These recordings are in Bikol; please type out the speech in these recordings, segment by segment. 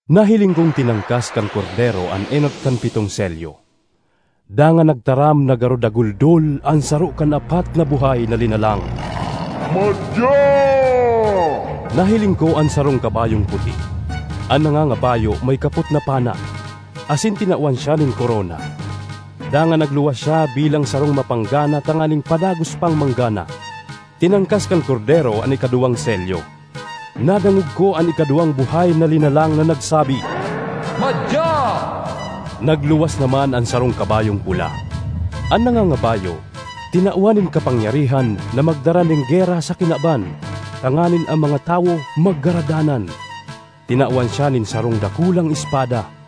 Nahiling kong tinangkas kan Kordero an enot kan pitong selyo, dangan nagtaram na garo daguldol an saro kan apat na buhay na linalang, “Madya!” Nahiling ko an sarong kabayong puti. An nangangabayo may kapot na pana, asin tinawan siya nin korona. Dangan nagluwas siya bilang sarong mapanggana tanganing padagos pang manggana. Tinangkas kan Kordero an ikaduwang selyo. Nadangog ko an ikaduwang buhay na linalang na nagsabi, “Madya!” Nagluwas naman an sarong kabayong pula. An nangangabayo tinawan nin kapangyarihan na magdara nin gera sa kinaban tanganing an mga tawo maggaradanan. Tinawan siya nin sarong dakulang espada.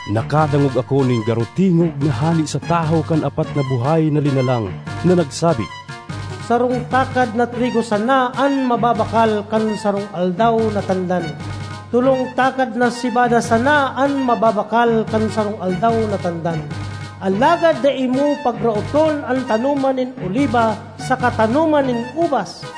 Nakadangog ako nin garo tingog na hale sa tahaw kan apat na buhay na linalang na nagsabi, “Sarong takad na trigo sana an mababakal kan sarong aldaw na tandan; tolong takad na sebada sana an mababakal kan sarong aldaw na tandan. Alagad dai mo pagraoton an tanoman nin oliba saka tanoman nin ubas!”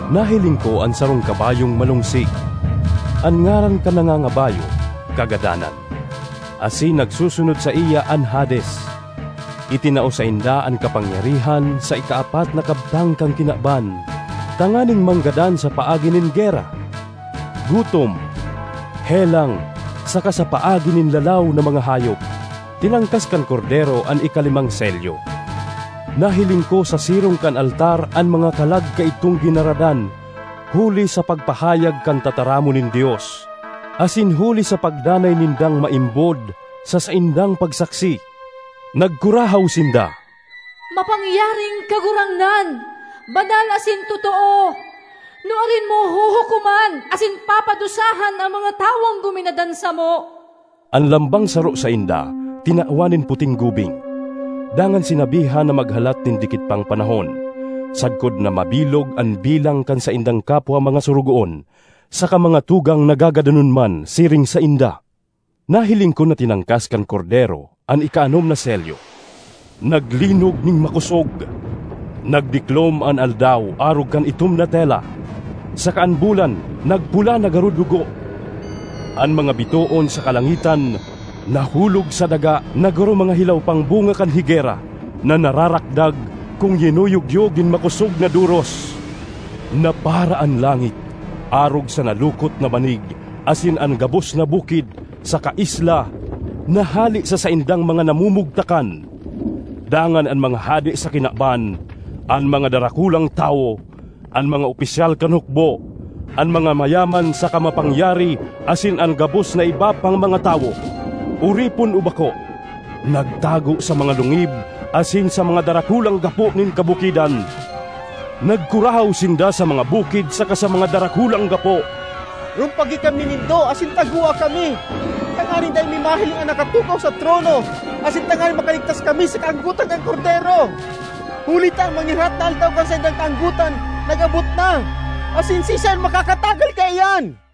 Nahiling ko an sarong kabayong malongsi. An ngaran kan nangangabayo, Kagadanan, asin nagsusunod saiya an Hades. Itinao sainda an kapangyarihan sa ikaapat na kabtang kan kinaban tanganing manggadan sa paagi nin gera, gutom, helang saka sa paagi nin lalaw na mga hayop. Tinangkas kan Kordero an ikalimang selyo. Nahiling ko sa sirong kan altar an mga kalag kaidtong ginaradan huli sa pagpahayag kan tataramon nin Dios, asin huli sa pagdanay nindang maimbod sa saindang pagsaksi. Nagkurahaw sinda, “Mapangyaring Kagurangnan, banal asin totoo! Nuarin mo huhukoman asin papadusahan an mga tawong guminadan samo?” An lambang saro sainda tinawan nin puting gubing, dangan sinabihan na maghalat nin dikit pang panahon, sagkod na mabilog an bilang kan saindang kapwa mga sorogoon saka mga tugang na gagadanon man siring sainda. Nahiling ko na tinangkas kan Kordero an ikaanom na selyo. Naglinog nin makosog, nagdiklom an aldaw arog kan itom na tela, saka an bulan nagpula na garo dugo; an mga bitoon sa kalangitan nahulog sa daga na garo mga hilaw pang bunga kan higera na nararakdag kun yinuyugyog nin makosog na doros. Napara an langit arog sa nalukot na banig asin an gabos na bukid saka isla nahale sa saindang mga namumugtakan. Dangan an mga hade sa kinaban, an mga darakulang tawo, an mga opisyal kan hukbo, an mga mayaman saka mga mapangyari asin an gabos na iba pang mga tawo, oripon o bako, nagtago sa mga lungib asin sa mga darakulang gapo nin kabukidan. Nagkurahaw sinda sa mga bukid saka sa mga darakulang gapo, “Rumpagi kami nindo asin tagoa kami tanganing dai mi mahiling an nakatukaw sa trono asin tanganing makaligtas kami sa kaanggotan kan Kordero! Huli ta an mangirhat na aldaw kan saindang kaanggotan nag-abot na asin siisay an makakatagal kaiyan?”